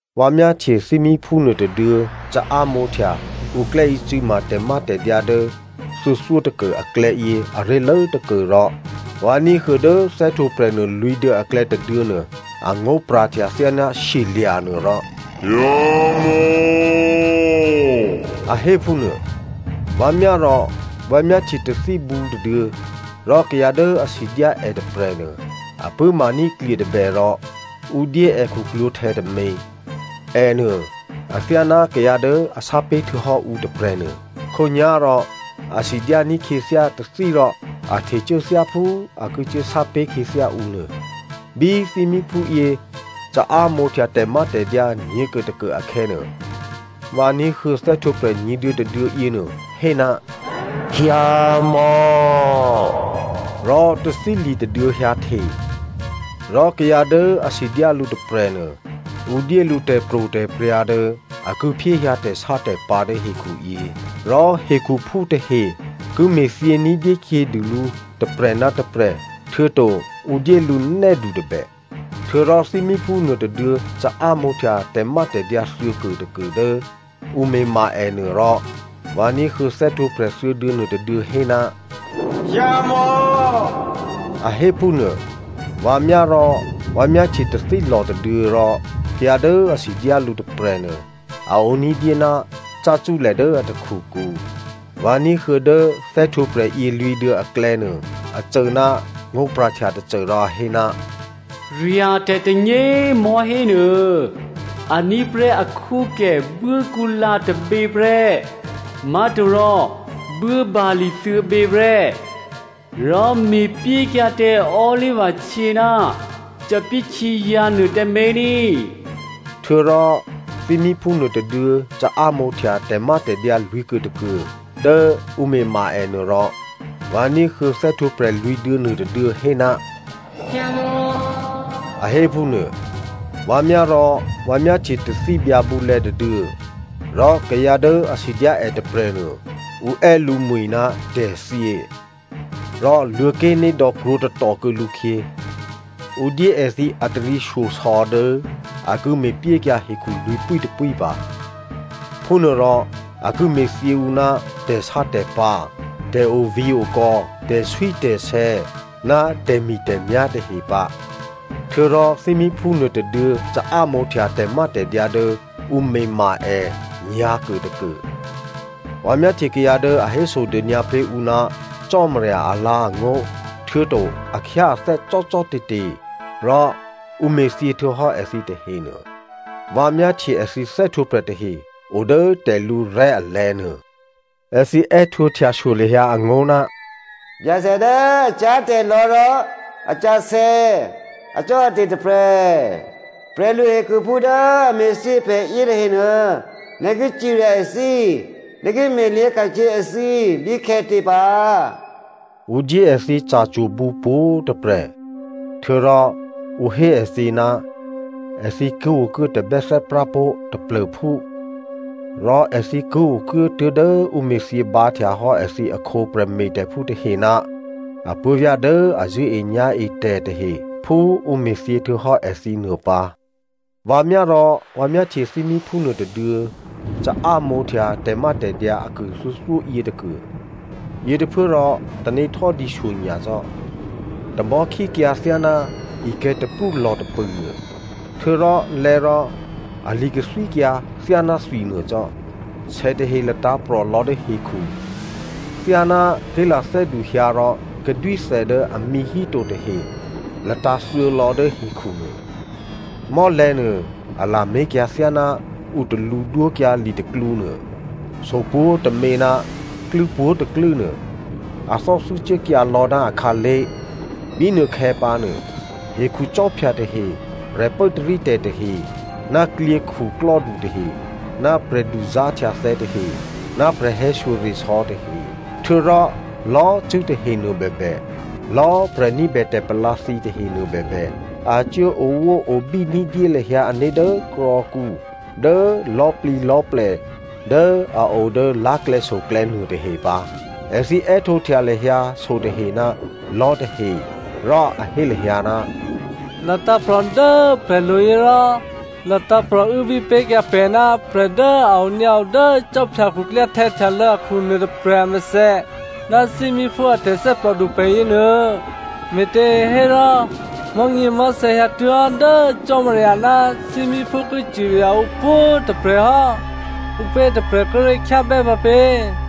Vǎ myáhtye thímíphú nuôtôduô̌ caámǒhtya ǔ klè́ícû̌ma tè̤mátè̤dyǎ dố thuô̌thyótôkuô aklè̌yě aré̤lố tôkuô rò vǎ ní̤huô̌ dố thè́htwǒprè̤ nuô lwǐ̤duô̌ aklè̌ tôduô̌nuô angó̤pra̤htya thyáná shyelya̤ nuô rò “hyǎmò̌” a hé phúnuô. Vǎ myá rò vǎ myáhtye tathíbǔ tôduô̌, rò kayǎ dố a sidyá è tôprè̤nuô a pṳ̂́maní̤ klye tôbè rò ǔ dyé è khuklwǒ̤htè̌ tômě. Ènuô, athyáná kayǎ dố a sápé̤ htuô̌hò́ ǔ tôprè̤ nuô. Khǒnyá̤rò a sidyání̤ khyěthyá tathí rò a htecuố thyáphú a ki cuốsápé̤ khyěthyá ǔ nuô. Bí thímíphúyě caámǒhtya tè̤mátè̤dyǎ nyě̤kuôtôkuô akhè̌nuô, vǎ ní̤huô̌ thè́htwǒprè̤ nyě̤duô̌ tôduô̌ yěnuô hé, “hyǎmò̌.” Rò tathíli̤ tôduô̌ hyǎhte, rò kayǎ dố a sidyá lǔ tôprè̤nuô, ǔ dyé lǔ tè̤pro̤tè̤prya̤ dố a ki phyéhyǎ tè̤sátè̤pǎ̤ dố hekhuyě. Rò hekhuphú tahe ki me̤thyě ní̤dyé khyědû lǔ tôprè̤ ná tôprè̤. Htuô̌to ǔ dyé lǔ nè́du꤮ tôbè. Htuô̌rò thímíphú nuôtôduô̌ caámǒhtya tè̤mátè̤dyǎ thuô̌kuôtôkuô dố ǔ me̤ma ènuô, rò vǎ ní̤huô̌ thè́htwǒprè̤ thuô̌duô̌ nuôtôduô̌ hé, “hyǎmò̌” a hé phúnuô. Vǎ myá rò vǎ myáhtye tathílò̤ tôduô̌ rò kayǎ dố a sidyá lǔ tôprè̤nuô a o ní̤dyé ná cácúlè dố a takhukǔ. Vǎ ní̤huô̌ dố thè́htwǒprè̤ yělwǐ̤duô̌ aklè̌ nuô, a cô ná ngó̤pra̤htya tôcô, rò a hé, “Rya̤tè̤ tônyě꤮ mò̤́hé nuô, a ní̤ prè́ akhwókè buốkǔlǎ tôbě prè́, má̤torò buốbali̤ thuô̌bě prè́. Rò me̤pyékyǎ tǎ olivahtyě ná thòbǐthèhtyězǎ̤ nuô tǎmé̤ ní꤮.” Htuô̌rò thímíphú nuôtôduô̌ caámǒhtya tè̤mátè̤dyǎ lwǐ̤kuôtôkuô dố ǔ me̤ma ènuô rò vǎ ní̤huô̌ thè́htwǒprè̤ lwǐ̤duô̌ nuôtôduô̌ hé, “hyǎmò̌” a hé phúnuô. Vǎ myá rò vǎ myáhtye tathí byǎbǔlè̌ tôduô̌. Rò kayǎ dố a sidyá è tôprè̤nuô ǔ è́ lǔmwi̤ ná tè̤thyě. Rò Luô̤̌ké̤nédò̌ krwǒtatò kuô̌ lǔkhyě. Ǔ dyé èthǐ ataryěshyosò̌ dố a ki me̤pyékyǎ hekhu lwǐ̤pwítôpwí pǎ. Phúnuôrò a ki me̤thyě ǔ ná tè̤sátè̤pǎ̤, tè̤ovǐ̤okò̌, tè̤swítè̤sè̌ ná tè̤mi̤tè̤myá̤ tahe pǎ. Htuô̌rò thímíphú nuôtôduô̌ caámǒhtya tè̤mátè̤dyǎ dố ǔ me̤ma è nyǎ̤kuôtôkuô. Vǎ myáhtye kayǎ dố a hésodônyǎ pé̤ ǔ ná Cò́marya alǎ̤angó̤, htuô̌to a khyáathè́ cò́cò́te̤te̤, rò ǔ me̤thyěhtuô̌hò́ èthǐ tahenuô, vǎ myáhtye èthǐ thè́htwǒprè̤ tahe odố tè̤lǔrè̤́ alè̤̌ nuô. Èthǐ è́htǒhtya shyo lahyǎ angó̤, “Byacè dố a cyá̤tè̤lò̌ rò a sǎsè̌, acò́ate̤ tôprè̤, prè̤luhekhuphú dố a me̤thyě pè̤ yětahenuô, nè̤ ki cirya èthǐ, nè̤ ki me̤lyě̤ ka̤khyě èthǐ bíkhè̌tě pǎ?” Ǔ dyé èthǐ ca̤cwo̤bǔ pwǒ̤꤮ tôprè̤, htuô̌rò ǔ hé èthǐ ná èthǐ ki okuố tabè́thè́prá pó̤ taplô̤phú. Rò èthǐ ki okuố tuố̤dố ǔ me̤thyě bǎhtya hò́ èthǐ akhǒ prè̤me̤tè̤phú tahe ná apuố̤vyá̤ dố a zṳ̂́enyá̤etè̤ tahe phú ǔ me̤thyěhtuô̌hò́ èthǐ nuô pǎ. Vǎ myá rò, vǎ myáhtye thímíphú nuôtôduô̌ caámǒhtya tè̤mátè̤dyǎ akuô thuô̌thyó yětôkuô. Yětôphuốrò, tanéhtò́dǐ shyonyacò́, tamò̤́ khíkyǎ thyáná ikè̤̌ taprú lò̤ tôpṳ̂ nuô, htuô̌rò lè̌ rò ali̤ kathwíkyǎ thyáná thwi nuô cò́. Sè tahe latǎ̤prò̤ lò̌ dố hekhu thyáná ké̤lathè́du hyǎ rò kadwíthè dố amǐ hí to tahe latǎ̤ thyělò̌ dố hekhu nuô. Mò́lè̤̌ nuô a lamé̤kyǎ thyáná ǔ talǔ dwókyǎ litaklǔ nuô. So pwǒ̤tômě ná klû́ pwǒ̤tôklû́ nuô, a thò́thû́ cuốkyǎ lò̌ ná akhǎlé̤. Bínuôkhè̌ pǎnuô, hekhu khwí tahe, prè̤pốtarítè̤ tahe ná klyě khuklò́du tahe ná prè̤duzá̤htyathè̌ tahe ná prè̤hè̌shyoresò̌ tahe, htuô̌rò lò̌꤮ cṳ̂́ tahenuô bèbè, lò̌꤮ prè̤ ní̤bè tè̤palǎ thǐ tahenuô bèbè, a cuố owóobí ní̤dyé lahyǎ ané̤ dố krò̌kǔ, dố lò̤́plǐlò̤́plè dố a o dố lá̤klè̌soklè̌ nuôtahe pǎ. Èthǐ è́htǒhtya lahyǎ sotahe ná lò̤́tahe rò a hé lahyǎ, “Latǎ̤prò̤ dố pè̤lo̤ yě rò latǎ̤prò̤ uốbí pé̤kyǎ pè̤ ná prè̤ dố a onyǎo dố khwí khuklyáhtè̌ htyalô̌ akhu nuôtôprè̤ amèthè ná thímíphú a tè̤thè́plòdu pè̤ yěnuô꤮. Me̤těhérò, mò̤́nyěmò̤́thè̌ hyǎtuố̤hò́ dố Cò́marya ná thímíphú ki cirya ǔ pwǒ̤꤮ tôprè̤hò́, ǔpě tôprè̤ kíré̤ khyábè́ pǎpě?”